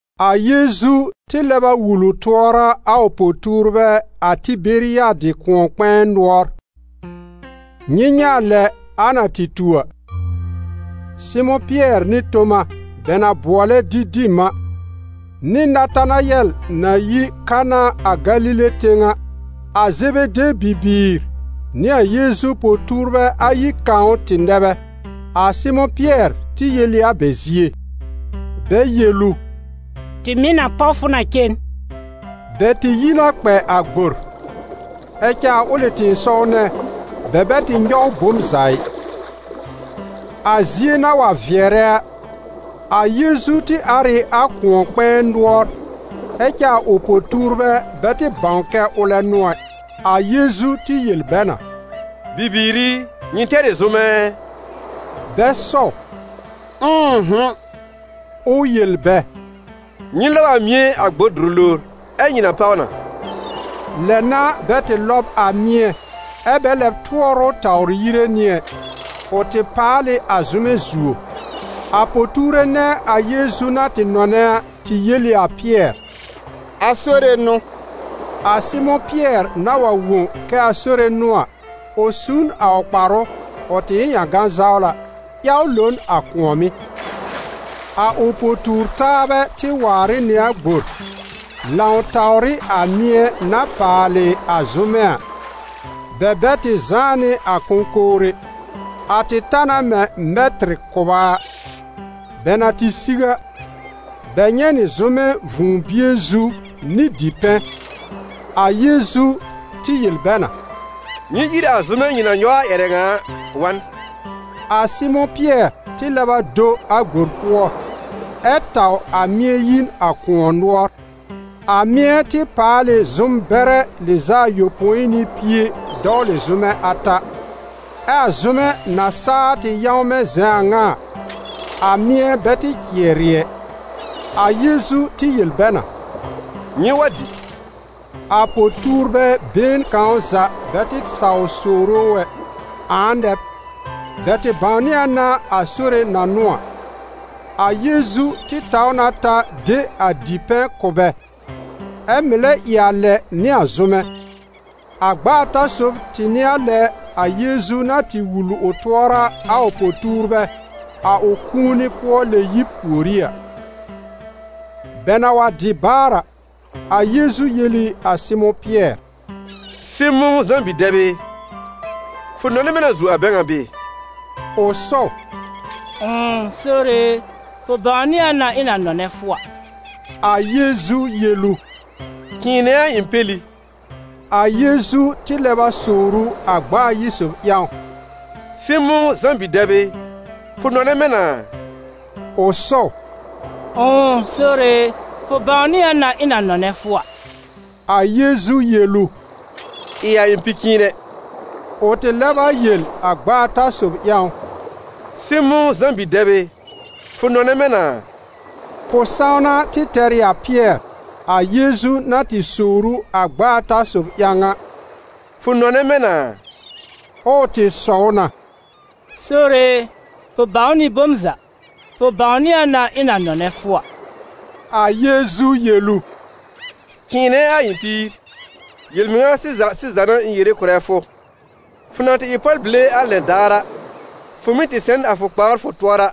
A Yeezu tɩ lɛb a wul ʋ tʋɔra a ʋ po-tuurbɛ a Tɩberiyadɩ kʋ̃ɔ-kpɛ̃ɛ nʋɔr. Nyɩ nyɛ̃ a lɛ a na tɩ tu a. Sɩmʋ̃ Pɩɛr nɩ Toma, bɛ na bʋɔlɛ Didim a, nɩ Natanayɛl na yi Kana a Galile tẽw a, a Zebede bibiir nɩ a Yeezu po-tuurbɛ ayi kãw tɩ nɛ bɛ. A Sɩmʋ̃ Pɩɛr tɩ yel ɩ a bɛ zie: «Mãa cere nɩ zʋ́mɛ nyɔwfʋ.» Bɛ yel ʋ: «Tɩ mɩ̀ na páw fʋ na cen.» Bɛ tɩ yi na kpɛ a gbor, ɛ cɛ a ʋlɩ tɩ̃ɩsɔw nɛ bɛ bɛ tɩ nyɔw bom za ɩ. A zie na wa vɩɛrɛ a, a Yeezu tɩ ar ɩ a kʋ̃ɔ-kpɛ̃ɛ nʋɔr, ɛ cɛ a ʋ po-tuurbɛ bɛ tɩ bãw kɛ ʋlɛ n'ʋ ɛ. A Yeezu tɩ yel bɛ na: «Bibiir i, nyɩ tɛr ɩ zʋ́mɛ ɛ?» Bɛ sɔw: «Ʋ̃ʋ'hʋ̃.» Ʋ yel bɛ: «Nyɩ lɔb a mɩ̃ɛ a gbor dʋrʋ lowr, ɛ́ nyɩ na páw na.» Lɛ n'a bɛ tɩ lɔb a mɩ̃ɛ, ɛ́ bɛ lɛb tʋɔr ʋ tawr yire nɩ ɛ: ʋ tɩ paal ɩ a zʋ́mɛ zuo. A po-tuure nɛ a Yeezu na tɩ nɔnɛ a tɩ yel ɩ a Pɩɛr: «A Sore n'ʋ!» A Sɩmʋ̃ Pɩɛr na wa wõ kɛ a Sore n'ʋ a, ʋ su n a ʋ kparʋ - ʋ tɩ ɩ n ƴãgã-zawla - ƴaw lo n a kʋ̃ɔ̀mɩ́. A ʋ po-tuur-taabɛ tɩ waar ɩ nɩ a gbor, lãw tawr ɩ a mɩ̃ɛ na paalɩ a zʋ́mɛ: bɛ bɛ tɩ zãá nɩ a kõkowr ɛ, a tɩ ta na mɛ̃ mɛtɩr kʋba a. Bɛ na tɩ siw a, bɛ nyɛ̃ nɩ zʋ́mɛ vũu-bie zu nɩ dipɛ̃. A Yeezu tɩ yel bɛ na: «Nyɩ ír a zʋ́mɛ nyɩ na nyɔw a ƴɛrɛ ŋa a wa n.» A Sɩmʋ̃ Pɩɛr tɩ lɛb a do a gbor pʋɔ, ɛ taw a mɩ̃ɛ yi n a kʋ̃ɔ nʋɔr, a mɩ̃ɛ tɩ paal ɩ zʋ́m-bɛrɛ lɩz'a ayopõi nɩ pie dɔwlɩ zʋ́mɛ ata. Ɛ a zʋ́mɛ na saa tɩ yãwmɛ̃ zɛ̃ a ŋa a, a mɩ̃ɛ bɛ tɩ cɩɛrɩ ɛ. A Yeezu tɩ yel bɛ na: «Nyɩ wa dɩ.» A po-tuurbɛ been kãw za bɛ tɩ saw sowre ʋ ɛ: «Ãa nɛ b?» Bɛ tɩ bãwnɩ a na a Sore na n'ʋ a. A Yeezu tɩ taw na ta de a dipɛ̃ kʋ̀ bɛ, ɛ mɩ̀ lɛ ɩ a lɛ nɩ a zʋ́mɛ. A gb'a ata sob tɩ n'ɩ a lɛ a Yeezu na tɩ wul ʋ tʋɔra a ʋ po-tuurbɛ a ʋ kũuni-pʋɔ-lɛ-yib pùorí a. Bɛ na wa dɩ baar a, a Yeezu yel ɩ a Sɩmʋ̃ Pɩɛr: «Sɩmʋ̃, Zã bi-dɛb ɩ, fʋ nɔnɛ mɛ̃ na zuo a bɛ ŋa bɩɩ?» Ʋ sɔw: «Ʋ̃ʋ, Sore e, fʋ bãwnɩ a na ɩ̃ na nɔnɛ fʋ a.» A Yeezu yel ʋ: «Cɩ̃ɩnɛ a ɩ̃ peli.» A Yeezu tɩ lɛb a sowr ʋ a gb'a ayi sob ƴãw: «Sɩmʋ̃, Zã bi-dɛb ɩ, fʋ nɔnɛ mɛ̃ na a?» Ʋ sɔw: «Ʋ̃ʋ, Sore, fʋ bãwnɩ a na ɩ̃ na nɔnɛ fʋ a.» A Yeezu yel ʋ: «Ɩ a ɩ̃ pi-cɩ̃ɩnɛ.» Ʋ tɩ lɛb a yel a gb'a ata sob ƴãw: «Sɩmʋ̃, Zã bi-dɛb ɩ, fʋ nɔnɛ mɛ̃ na a?» Pʋ-sãwna tɩ tɛr ɩ a Pɩɛr, a Yeezu na tɩ sowr ʋ a gb'a ata sob ƴãw a: «Fʋ nɔnɛ mɛ̃ na a?» Ɛ ʋ tɩ sɔw na: «Sore e, fʋ bãw nɩ bom za, fʋ bãwnɩ a na ɩ̃ na nɔnɛ fʋ a.» A Yeezu yel ʋ: «Cɩ̃ɩnɛ a ɩ̃ píir. Yel-mɩŋa sɩza sɩza n'a ɩ̃ yere kʋ̀rɛ fʋ: fʋ na tɩ ɩ pɔlbile a lɛn daar a, fʋ mɩ́ tɩ sɛ n a fʋ kpawr fʋ tʋɔra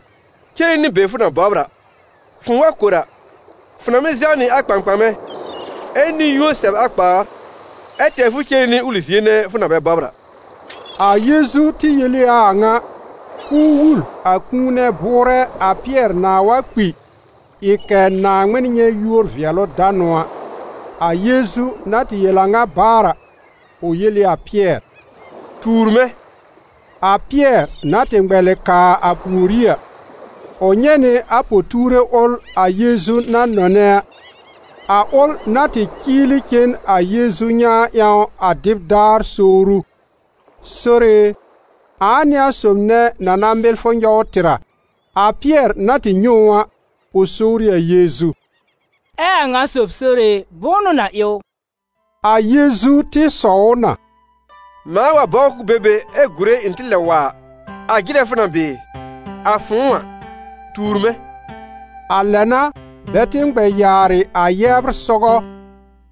cere nɩ be fʋ na bɔbr a; fʋ̃ʋ wa kor a, fʋ na mɩ́ zɛw nɩ a kpãkpãmɛ ɛ nɩ-yũo sɛ b a kpawr, ɛ tɛr fʋ cere nɩ ʋlɩ zie nɛ fʋ na bɛ bɔbr a.» A Yeezu tɩ yel ɩ a a ŋa, k'ʋʋ wul a kũu nɛ bʋʋrɛ a Pɩɛr nãá wa kpi ɩ kɛ̀ Naaŋmɩn nyɛ̃ yúor-vɩɛlʋ-danʋ a. A Yeezu na tɩ yel a ŋa baar a, ʋ yel ɩ a Pɩɛr: «Tuur mɛ̃!» A Pɩɛr na tɩ ŋmɛlɩ kaa a pùorí a, ʋ nyɛ̃ nɩ a po-tuure ʋl a Yeezu na nɔnɛ a, a ʋl na tɩ cɩɩlɩ cen a Yeezu nyãa ƴãw a dɩb daar sowr ʋ: «Sore e, ãa n'ɩ a sob nɛ na na mɩl fʋ nyɔw tɩr a?» A Pɩɛr na tɩ nyɛ̃ ʋ a, ʋ sowr ɩ a Yeezu: «Ɛ a ŋa sob, Sore e, bʋ̃ʋ n'ʋ na ɩ ʋ?» A Yeezu tɩ sɔw ʋ na: «Mãa wa bɔbr k'ʋʋ be be ɛ gùre ɩ̃ tɩ lɛb wa a, a jɩrɛ fʋ na bɩɩ? A fʋ̃ʋ a, tuur mɛ̃!» A lɛ n'a bɛ tɩ ŋmɛ yaarɩ a yɛbr sɔgɔ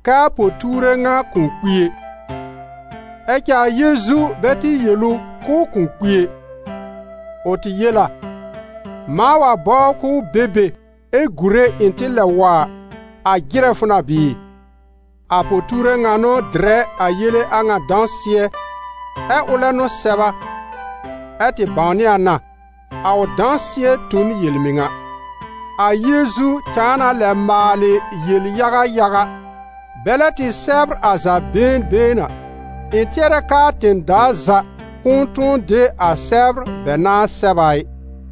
kɛ a po-tuure ŋa kʋ̃ kpi ɛ. Ɛ cɛ a Yeezu bɛ tɩ yel ʋ k'ʋʋ kʋ̃ kpi ɛ. Ʋ tɩ yel a: «Mãa wa bɔbr k'ʋʋ be be ɛ gùre ɩ̃ tɩ lɛb wa a, a jɩrɛ fʋ na bɩɩ?» A po-tuure ŋa n'ʋ dɩrɛ a yele a ŋa dãsɩɛ, ɛ ʋlɛ n'ʋ sɛb a, ɛ tɩ bãwnɩ a na, a ʋ dãsɩɛ tu n yel-mɩŋa. A Yeezu cãa na lɛ maalɩ yel-yaga yaga: bɛlɛ tɩ sɛbr a za been been a, ɩ̃ tɩɛrɛ k'aa tẽ-daa za kʋ̃ʋ tʋ̃ɔ de a sɛbr bɛ nãá sɛb a ɩ.